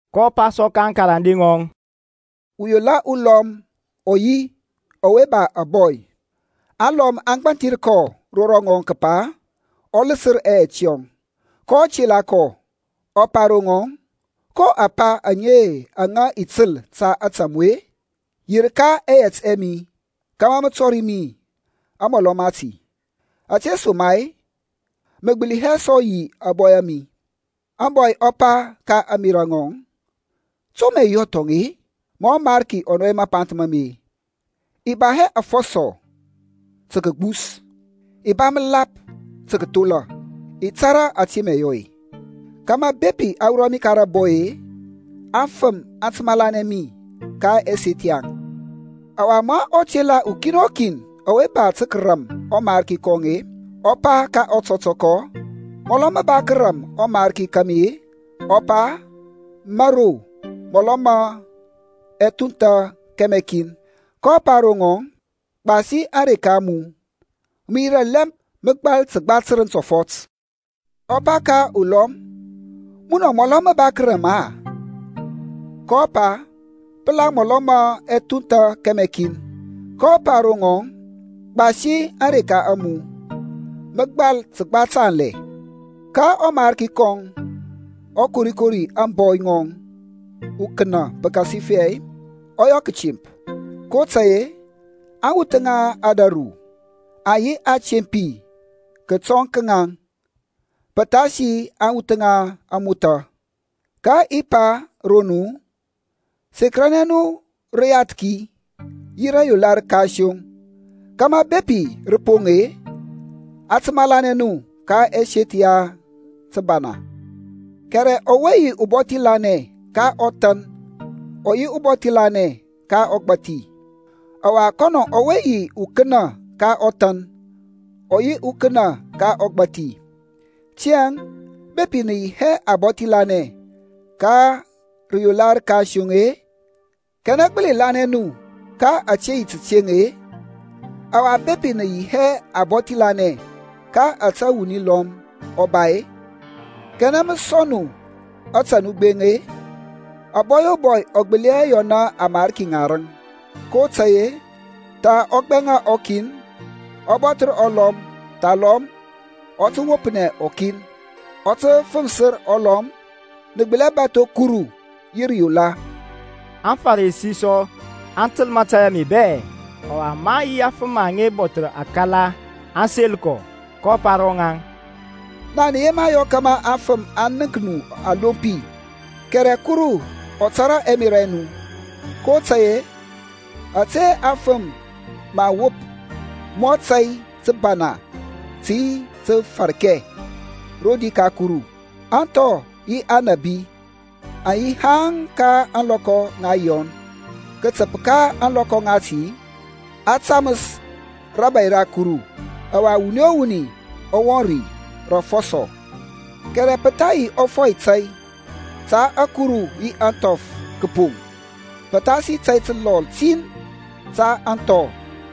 kɔ pa sɔ ka aŋkarande ŋɔŋ, Uyola ulɔm ɔ yi ɔwe ba ȧbɔy. Aŋlɔm aŋ gbanthir kɔ ro rɔŋɔŋ kəpa ɔ ləsər ɛyɛt yɔŋ. kɔ tela kɔ, ɔ pa ro ŋɔŋ, Ko apa aŋe aŋa i təl ta ȧtȧ mu-e? Yirka ɛyɛt ɛ mi kȧmȧ mə tɔri mi amɔlɔ mati, ȧtesoma-e mə gbəli hɛ sɔ yi ȧbɔy a mi. Ȧŋbɔy ɔ pa ka ȧŋmerȧ ŋɔŋ, To mə i yɔ thɔŋ-e, ma ɔmarki ɔ nɔy mapanth ma mi-e? I ba hɛ afɔsɔ tə kəgbus; i ba məlap tə kəthola. I tȧrȧ ȧte mə i yɔ-e, kȧmȧ, bepi a wurɔ mi ka rȧbɔy-e, aŋfəm aŋ tə malanɛ mi ka ɛseth yaŋ. Ɔwa ma ɔ tela ukin o kin ɔwe ba tə kəram ɔmarki kɔŋ-e ɔ pa ka ɔtɔtɔkɔ, Mɔlɔ mə ba kəram ɔmarki ka mi-a? Ɔ pa, Mȧro mɔlɔ ma ɛthuntha kɛmɛ kin. Kɔ pa ro ŋɔŋ, Gbasi ȧŋreka a mu, mə yirȧ lɛmp mə gbal təgba tərəŋ tɔfɔt. Ɔ pa ka ulɔm, Munɔ mɔlɔ mə ba kərȧm-a? kɔ pa, Pəla mɔlɔ ma ɛthuntha kɛmɛ kin. Kɔ pa ro ŋɔŋ, Gbasi ȧŋreka a mu, mə gbal təgba tanlɛ. Ka ɔmarki kɔŋ ɔ korikori ȧŋbɔy ŋɔŋ ukənə pəkasifɛ ɔ yɔ kətemp; kotȧy-e aŋwuth ŋa ȧdȧru aŋ yi atempi kətɔŋ ka ŋaŋ pəthasi aŋwuth ŋa ȧŋmothȧ. Ka i pa ro nu, Sekəranɛ nu rəyathki yi rayola rəkansoŋ, kȧmȧ bepi rə poŋ-e, a tə malanɛ nu ka ɛseth ya thəbana. Kɛrɛ ɔwe yi ubɔthi lanɛ ka ɔthan ɔ yi ubɔthi lanɛ ka ɔgbȧthi; ɔwa kɔnɔ ɔwe yi ukənə ka ɔthan ɔ yi ukənə ka ɔgbȧthi. Tiyȧŋ bepi nə yi hɛ abɔthi lanɛ ka rəyola rəkansoŋ-e, kanɛ gbəli lanɛ nu ka ȧte yi tateŋ-e? Ɔwa bepi nə yi hɛ abɔthi lanɛ ka ȧte wuni lɔm ɔ ba-e, kanɛ mə sɔŋ nu ȧtȧ nu gbeŋ-e? Abɔy o bɔy ɔ gbəli hɛ yɔna amarki ŋarəŋ, kotȧy-e tha ɔ gbɛŋa ɔkin, ɔ bɔthər ɔlɔm; thalɔm ɔ tə wopnɛ ɔkin, ɔ tə fəŋfsir ɔlɔm. Nə gbəli hɛ bȧtho Kuru yi rəyola. AŋFarisi sɔ aŋ təl mȧtȧy ame bɛ; ɔwa maŋ yi afəm aŋa bɔthər akala aŋ sel kɔ. kɔ pa ro ŋaŋ, Naŋ nə yema yɔ kȧmȧ afəm aŋ nənk nu alompi kɛrɛ Kuru ɔ tȧrȧ ɛmerȧ ɛ nu, kotȧy-e ȧte aŋfəm mə aŋ wop mɔ tȧy təbana tə yi təfarkɛ rodi ka Kuru. Ȧŋthɔ yi aŋnabi aŋ yi haŋ ka ȧŋlɔkɔ ŋa Yɔn. Kətəp ka ȧŋlɔkɔ ŋati a taməs rȧbȧy ra Kuru, ɔwa wuni o wuni ɔ wɔŋ ri rə afɔsɔ. Kɛrɛ pə tha yi ȧfɔy tȧy ta ȧkuru yi ȧŋthɔf kəpoŋ pəthasi tȧy təlɔl tin ta aŋthɔ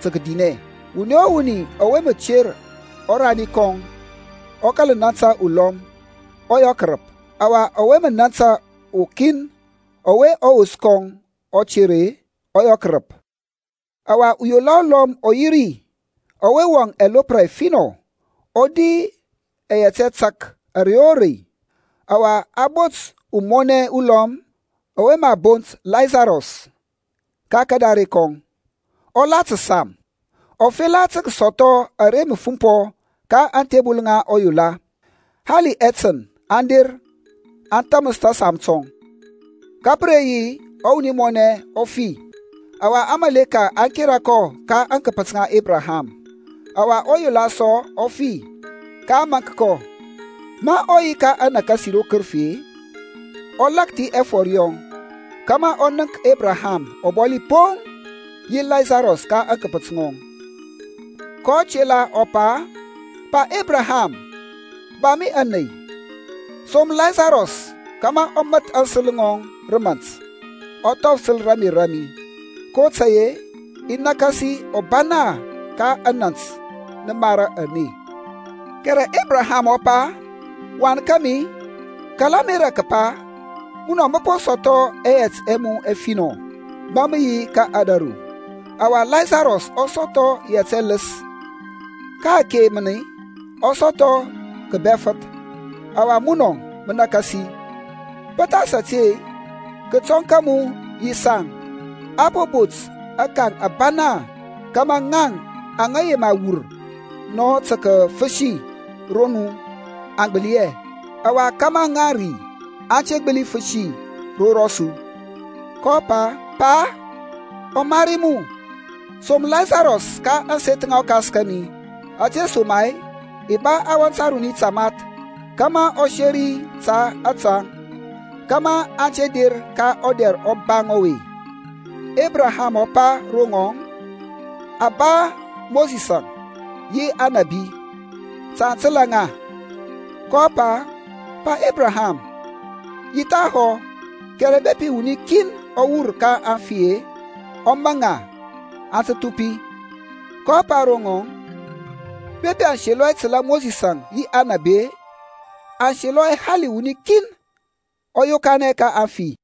tə kədinɛ. Wuni o wuni ɔwe mə ter ɔrani kɔŋ, ɔ kȧl nȧntȧ ulɔm, ɔ yɔ kərəp; ɔwa ɔwe mə nȧntȧ ukin ɔwe ɔwos kɔŋ ɔ ter-e, ɔ yɔ kərəp. Ɔwa uyola ulɔm ɔ yi ri ɔwe wɔŋ ɛlopra ɛfinɔ, ɔ di ɛyɛt ɛtȧk ȧrey o rei. Ɔwa a bot umɔnɛ ulɔm ɔwe mə a bont Lasarus ka kadare kɔŋ, ɔ la təsam, ɔ fela tə kəsɔthɔ ara mə fumpɔ ka aŋthebəl ŋa ɔyola; hali ɛtən aŋ der aŋ thȧməs tȧsam tɔŋ. Ka pə re yi ɔwuni mɔnɛ ɔ fi, ɔwa aŋmȧleka aŋ kera kɔ ka aŋkəpət ŋa Ebraham. Ɔwa ɔyola sɔ ɔ fi, ka a maŋk kɔ. Ma ɔ yi ka anakasi ro kərəfi-e, ɔ lakthi ɛfɔr yɔŋ, kȧmȧ ɔ nənk Ebraham ɔbɔli poŋ yi Lasarus ka aŋkəpət ŋɔŋ. kɔ tela ɔ pa, Pa Ebraham, ba mi ȧney, som Lasarus kȧmȧ ɔ məth aŋsəl ŋɔŋ rə mȧnt, ɔ thɔfsəl ramer ra mi, kotȧy-e i nakasi ɔbana ka anant nəmara ane. Kɛrɛ Ebraham ɔ pa, Wan kȧmi, kala ȧmerȧ kəpa munɔ mə po sɔthɔ ɛyɛt ɛ mu ɛfinɔ ma mə yi ka ȧdȧru, ɔwa Lasarus ɔ sɔthɔ yɛt ɛləs; ka-ake mən ɔ sɔthɔ kəbɛfəth, ɔwa munɔ mə nakasi. Pəthas ȧte, kətɔŋ ka mu yi saŋ a po bot akaŋ abana kȧmȧ ŋaŋ aŋa yema wur nɔ tə kəfəsi ro nu aŋ gbəli hɛ; ɔwa kȧmȧ ŋaŋ ri aŋ te gbəli fəsi ro rɔsu. kɔ pa, Pa, ɔmari mu, som Lasarus ka ȧŋseth ŋa ɔkas kȧmi, ȧtesoma-e i ba awɔnt aruni tamath kȧmȧ ɔ seri ta ȧtaŋ, kȧmȧ aŋ te der ka ɔdɛr ɔbaŋ ɔwe. Ebraham ɔ pa ro ŋɔŋ, Aŋ ba Mosisȧŋ yi aŋnabi. Ta aŋ təlȧ ŋa. kɔ pa, Pa Ebraham, yi thahɔ, kɛrɛ bepi wuni kin ɔ wur ka aŋfi-e, ɔ maŋ ŋa, aŋ tə thupi. kɔ pa ro ŋɔŋ, Bepi aŋ selɔ hɛ tə kətəla Mosisȧŋ yi aŋnabi-e, aŋ selɔ hɛ hali wuni kin ɔ yokanɛ ka aŋfi.